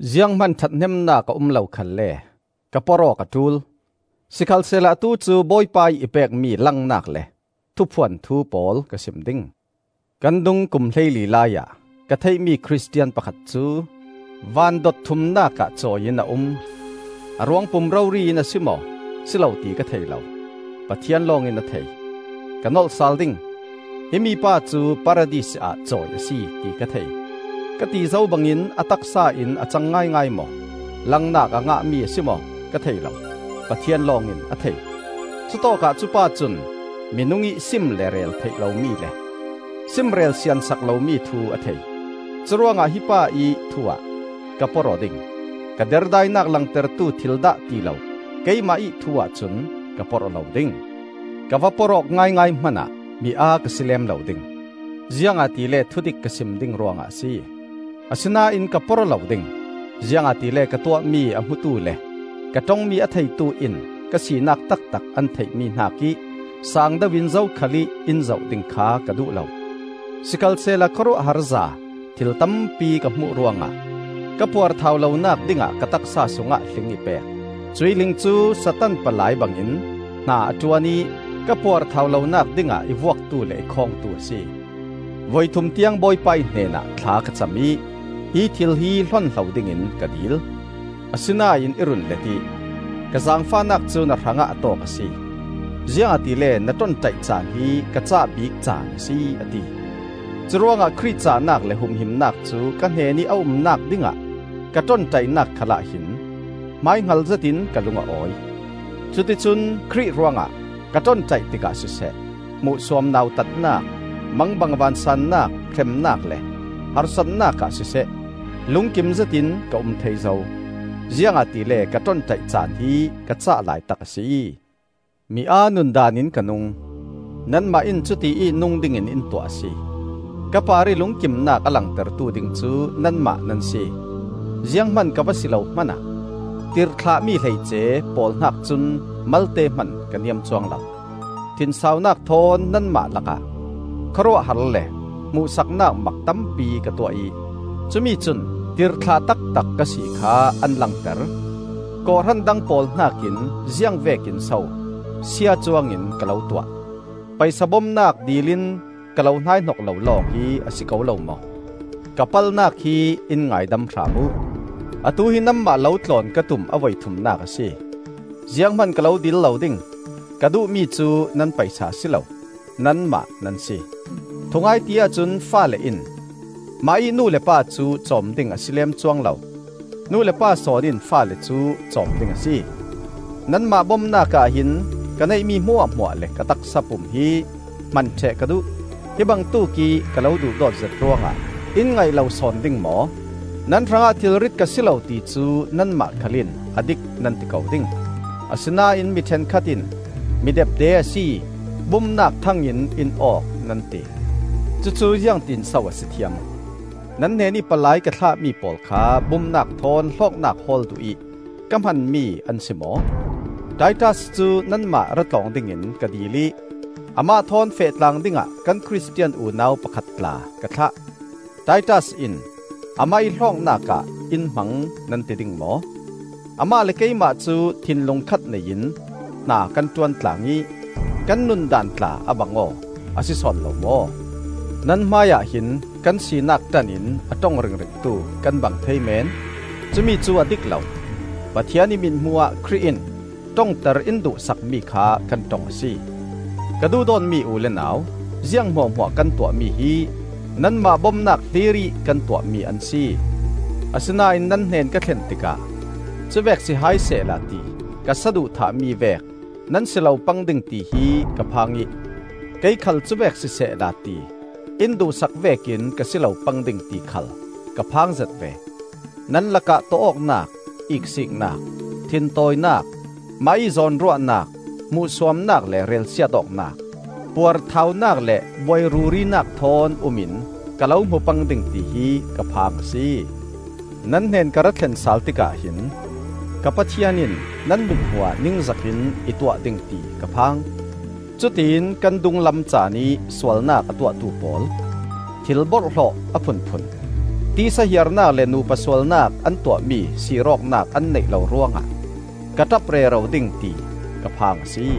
Zianghman ṭhathnemnak a um lo khalle ka porh awk a ṭul. Sikhalsehla atu cu Bawipa ih i pekmi langnak le thuphuan thu pawl ka sim ding. Kan dung kum hleili laiah ka theihmi Khristian pakhat cu van dot thumnak ah cawi in a um. (A ruangpum rori in a si maw, si lo ti ka thei lo; Pathian lawng in a thei.) Ka nolh sal ding; himi pa cu Paradis ah cawi a si, ti ka thei. (Ka ti zo bangin, a taksa in a cang ngaingai maw, langnak a ngahmi a si maw, ka thei lo; Pathian lawng in a thei.) Cutawkah cupa cun minung ih sim le rel theih lomi le simrel siansak lomi thu a thei. Curuangah hi pa ih thuah ka porh aw ding; ka derdainak langtertu thil dah tilo keimah ih thu-ah cun ka porh aw lo ding. Ka va porh awk ngaingai hmanah mi aa ka si lem lo ding, ziangahtile thudik ka sim ding ruangah a si. Asinain ka porh aw lo ding, ziangahtile ka tuahmi a hmutu le ka ṭongmi a theitu in ka sinak taktak an theihmi hnakih sangdeuh in zokhal ih in zoh ding kha ka duh lo. Sikhalsehla khawruahharza thil tampi ka hmuh ruangah ka puarthau lonak dingah ka taksa sungah hling i pek. Cuih hling cu Satan palai bangin hna a ṭuan ih ka puarthau lonak dingah i vuaktu le i khawngtu a si. Voithum tiang Bawipa ih hnenah thla ka cam ih hi thil hi hlonhlo dingin ka dil. Asinain i run let ih, “Ka zaangfahnak cu na hrangah a tawk a si; ziangahtile na ṭonṭaih caan hi ka cah bik caan a si,” a ti. Curuangah Khrih cahnak le humhimnak cu ka hnenih a umnak dingah ka ṭonṭaihnak khalah hin hmaihngal zetin ka lung a awi. Cuticun Khrih ruangah ka ṭonṭaih tikah siseh, hmuhsuam nautatnak, mangbang vansaannak, hremnak le harsatnak ah siseh, lungkim zetin ka um thei zo. Ziangahtile ka ṭonṭaih caan hi ka cah laitak a si. Mi aa nundaan in ka nung; nanmah in cutiih nung dingin in tuah a si! Ka parih lungkimnak a langtertu ding cu nanmah nan si. Zianghman ka va si lo hmanah, “Tirhthlahmi hleice,” pawl hnak cun malte hman ka niam cuang lo. Thinsaunak thawn nanmah lakah khawruahhar le hmuhsaknak mak tampi ka tuah ih cumi cun tirhthlah taktak ka si kha an langter. Kawhhran dang pawl hnakin ziang vekin so sia cuangin ka lo tuah? Paisa bomnak dilin ka lo hnaihnok lo lawng hi a si ko lo maw? Ka palhnak hi in ngaidam hram uh. Atu hi nanmah lo tlawn ka tum a voithumnak a si, zianghman ka lo dil lo ding. Ka duhmi cu nan paisa a si lo, nanmah nan si. Thungai ti ahcun faale in mahih nu le pa cu cawm ding a si leem cuang lo; nu le pa sawn in faale cu cawm ding a si. Nanmah bomnak ah hin ka neihmi hmuahhmuah le ka taksa pum hi hman ṭheh ka duh. Hi bangtuk ih ka lo duhdawt zet ruangah in ngaih lo sawn ding maw? Nan hrangah thilrit ka si lo ti cu nanmah khal in a dik nan ti ko ding. Asinain mi ṭhenkhat in, mi depde a si, bumnak thang in in awk, nan ti. Cucu ziangtinso a si thiam? Nan hnenih palai ka thlahmi pawl kha bumnak thawn hlawknak hawl duhih ka hmanmi an si maw? Titas cu nanmah ra tlawng dingin ka dil ih amah thawn fehtlang dingah kan Khristian unau pakhat tla ka thlah. Titas in amah ih hlawknak ah in hmang nan ti ding maw? Amah le keimah cu thinlung khat nei in hna kan ṭuantlang ih kan nundaan tla a bang aw, a si sawn lo maw? Nan hmaiah hin kan sinak ṭan in a ṭong ringringtu kan bang thei meen. Cumi cu a dik lo! Pathian ih mithmuh ah Khrih in ṭongter in duhsakmi kha kan ṭong a si. Ka duhdawtmi u le nau, ziang hmuahhmuah kan tuahmi hi nanmah bomnak hlirih kan tuahmi an si. Asinain nan hnen ka thlen tikah cuvek si hai sehla ti ka saduhthah mi vek nan si lo pang ding tihi ka phang ih, kei khal cuvek sisehla ti in duhsak vekin ka si lo pang ding ti khal ka phangzet ve. Nan lakah tawh awknak, iksiknak, thintawinak, mahih zawnruahnak, hmuhsuamnak le relsiat awknak, puarthaunak le buai rurinak thawn um in ka lo hmu pang ding tihi ka phang a si. Nan hnen ka ra thlen sal tikah hin ka Pathian in nan mithmuh ah ningzak in i tuah ding ti ka phang; cutin kan dunglam caanih sualnak a tuahtu pawl, thil borhhlawh a phunphun, tisa hiarnak le nu pa sualnak an tuahmi sir awknak an neih lo ruangah ka ṭap rero ding ti ka phang a si.